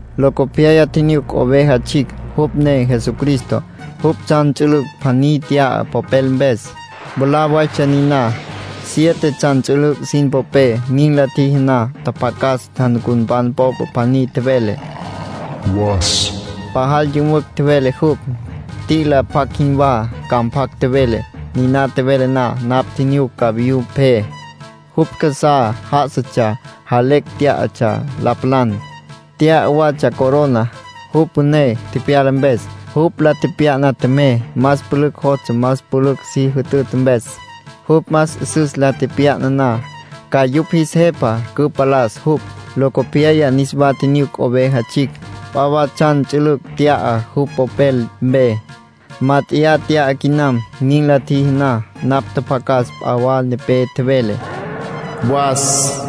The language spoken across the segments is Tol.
Locopyaya tjinyuc Oveja Tsjicj (jupj ne Jesucristo). Jupj tsjan ts'ülüc' pjaní nt'ya popel mpes. Mwalá waytsja niná, siete tsjan ts'ülüc' sin popé. Nin la tjiji na, tjapjacas janucunpan popa pjaní tjevele: “Was”. Pajal yümücj tjevele jupj, t'i'ila pjac jinwá ca mpjac tjevele. Niná tjevele na, napj tjinyuc cavayú pje. Jupj casá já'asatsja jalecj tyá'atsja la palan. Nt'ya watsja corona, jupj püné tepyala mpes. Jupj la tepya'na tjemey, más pülücj jostsja más pülücj si jütüta mpes. Jupj más 'üsüs la tepya'na na, ca yupj jis jepa cüpalas jupj. Locopyaya niswa tjinyuc Oveja Tsjicj. P'a wa tsjan ts'ülüc' nt'ya jupj popel mpe. (Mát'eya nt'ya quinam.) Nin la tjiji na, napj tjapjacas p'a wa nepé tjevele. “Was”, tjevele jupj.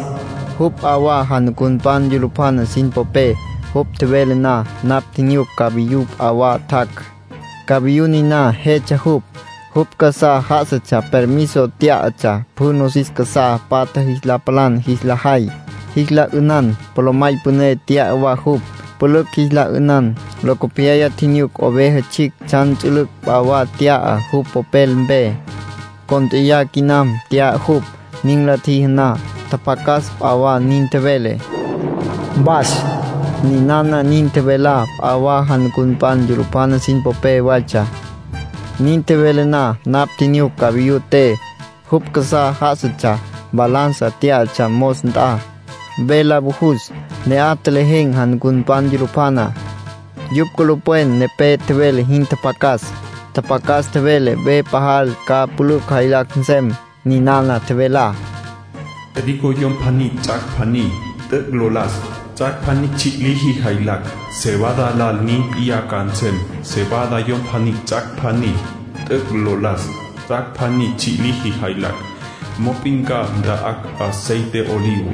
Jupj p'a wa janucunpan yulupjana sin popé. Jupj tjevele na, napj tjinyuc cavayú p'a wa tjac'. Cavayú niná jetsja jupj. Jupj casá já'asatsja permiso tyá'atsja pjü nosis casá patja jis la palan jis la jay, jis la 'ünan. Polomay püné nt'ya wa jupj, pülücj jis la 'ünan. Locopyaya tjinyuc Oveja Tsjicj tsjan ts'ülüc' p'a wa nt'ya jupj popel mpe. (Cónt'eya quinam nt'ya jupj.) Nin la tjiji na, tjapjacas p'a wa nin tjevele: “Was”. Ninana nin tjevelá p'a wa janucunpan yulupjana sin popé waytsja. Nin tjevele na, napj tjinyuc cavayú te. Jupj casá já'asatsja, balanza tyá'atsja mos nt'a, ve la vujus. Ne'aj tjelejen̈ janucunpan yulupjana. Yupj culupwen nepé tjevele jin tjapjacas. Tjapjacas tjevele ve pajal ca pülücj jaylacj nsem. Ninana tjevelá: “Trigo yom pjaní ts'ac' pjaní t'üc' lo las, ts'ac' pjaní tsji' liji jaylacj. Cebada lal nin p'iyá ca nsem. Cebada yom pjaní ts'ac' pjaní t'üc' lo las, ts'ac' pjaní tsji' liji jaylacj. Mop'in ca nta'acj aceite olivo.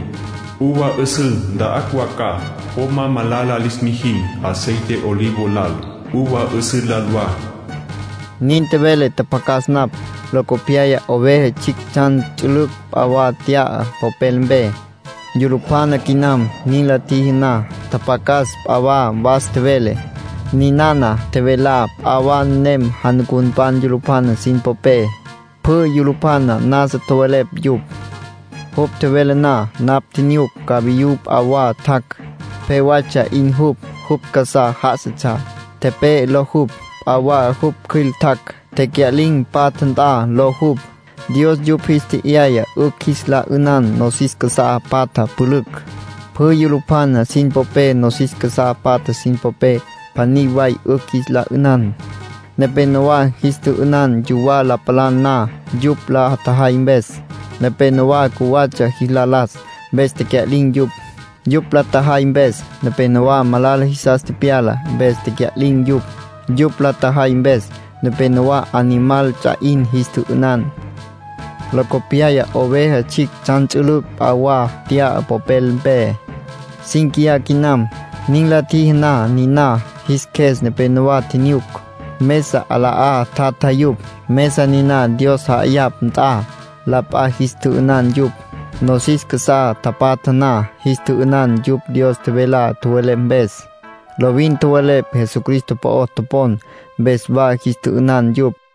Uva 'üsǘ nta'acj wa ca. Po ma malala lis mijin aceite olivo lal, uva 'üsǘ lal wa”, nin tjevele tjapjacas napj. Locopyaya Oveja Tsjicj tsjan ts'ülüc' p'a wa nt'ya popel mpe. (Yulupjana quinam.) Nin la tjiji na, tjapjacas p'a wa was tjevele. Ninana tjevelá p'a wa nenem janucunpan yulupjana sin popé. Pjü yulupjana nasa tjowelepj yupj. Jupj tjevele na, napj tjinyuc cavayú p'a wa tjac'. Pje waytsja 'in jupj. Jupj casá já'asatsja “Tepe'e” ló jupj. P'a wa jupj cjüil tjac'. “Tecya'lin̈ Patja Nt'a” ló jupj. Dios yupj jis tje'yaya 'ücj jis la 'ünan nosis casá patja pülücj. Pjü yulupjana sin popé nosis casá patja sin popé, pjaní way 'ücj jis la 'ünan. Nepénowa jis tjü'ünan yuwá la tapalan na. Yupj la tjajay mpes, nepénowa cjuwatsja jis la las, mpes tecya'lin̈ yupj. Yupj la tjajay mpes, nepénowa malala jisas tepyala, mpes tecya'lin̈ yupj. Yupj la tjajay mpes, nepénowa animal ts'a 'in jis tjü'ünan. Locopyaya Oveja Tsjicj tsjan ts'ülüc' p'a wa nt'ya popel mpe. (Cínquiya quinam.) Nin la tjiji na niná, jis qjues nepénowa tjinyuc. Mesa 'ala'á tjatja yupj, mesa niná Dios ja'ayapj nt'a. La p'a jis tjü'ünan yupj, nosis casá tapatja na. Jis tjü'ünan yupj Dios tjevelá tjowelepj mpes. Lovin tjowelepj Jesucristo po'o topon, mpes wa jis tjü'ünan yupj.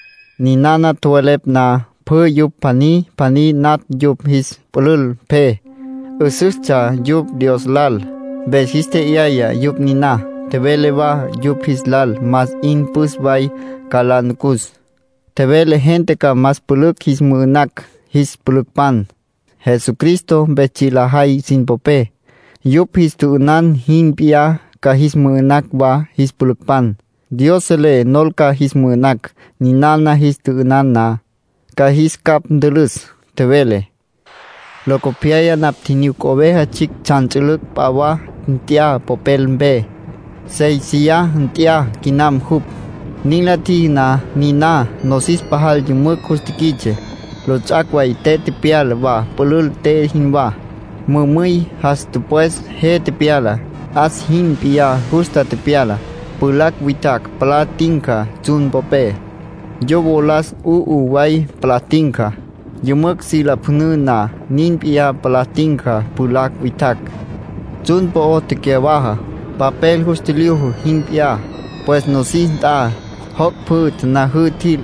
Ninana tjowelepj na, pjü yupj pjaní pjaní natj yupj jis pülül pje. 'Üsüstsja yupj Dios lal, mpes jis tje'yaya yupj niná. Tjevele wa yupj jis lal más 'in püs way ca la nucus. Tjevele gente ca más pülücj jis mü'ü'nacj jis pülücpan, Jesucristo mpes tsji' lajay sin popé. Yupj jis tjü'ünan jin p'iyá ca jis mü'ü'nacj wa jis pülücpan. Dios selé nol ca jis mü'ü'nacj. Ninana jis tjü'ünan na, ca jis capj ntülüs, tjevele. Locopyaya napj tjinyuc Oveja Tsjicj tsjan ts'ülüc' p'a wa nt'ya popel mpe. (Séisiya nt'ya quinam jupj.) Nin la tjiji na niná, nosis pajal yümücj jus tiquits'e. Lots'ac' way te tepyala wa pülül te jinwá. Mümüy jas tüpwes je tepyala, 'as jin p'iyá justa tepyala. Pjulacj witjacj palá tinca tsjun popé. Yo wolas 'u'u way palá tinca, yümücj si lapjüna na, nin p'iyá palá tinca pjulacj witjacj. Tsjun po'ó tecyawaja, papel jus tjilyuju jin p'iyá. Pues nosis nt'a, joc' pjü tanajǘ tjil.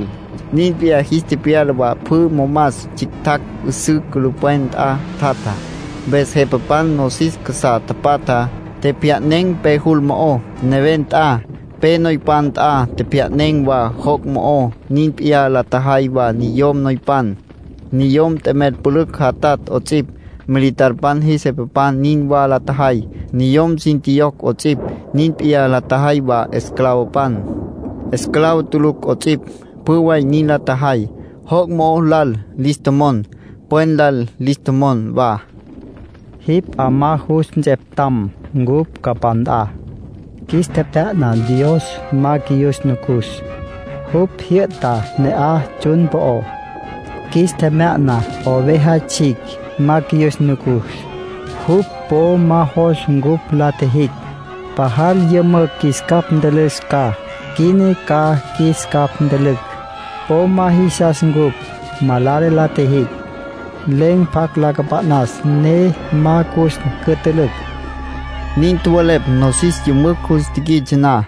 Nin p'iyá jis tepyala wa pjü momas tsjictjacj 'üsǘ culupwen nt'a tjatjá. Mpes jepapan nosis casá tapatjá, tjepjya'nen̈ pe jul mo'ó, neven nt'a. Pe noypan nt'a tjepjya'nen̈ wa joc' mo'ó. Nin p'iyá la tjajay wa niyom noypan, niyom t'emel pülücj jatatj 'ots'ipj. Militarpan jis jepapan nin wa la tjajay, niyom sin tjiyocj 'ots'ipj. Nin p'iyá la tjajay wa esclavopan, esclavo tulucj 'ots'ipj. Pjü way nin la tjajay. Joc' mo'ó lal lis tjomon, pwen lal lis tjomon wa: “Jipj 'amá jus nts'eptam cupj capá nt'a. Qjuis tjepjya'na Dios ma qjuiyus nucus. Jupj jyü'ta ne'aj tsjun po'ó. Qjuis tjepjya'na Oveja Tsjicj ma qjuiyus nucus. Jupj po ma jos cupj la tjijicj. Pajal yümücj qjuis capj ntülüs ca. Quina ca qjuis capj ntülücj. Po ma jisas cupj malala la tjijicj. Len̈ pjacj la cüpa'nas ne ma ca cus cütülücj”, nin tjowelepj nosis yümücj jus tiquits'e na.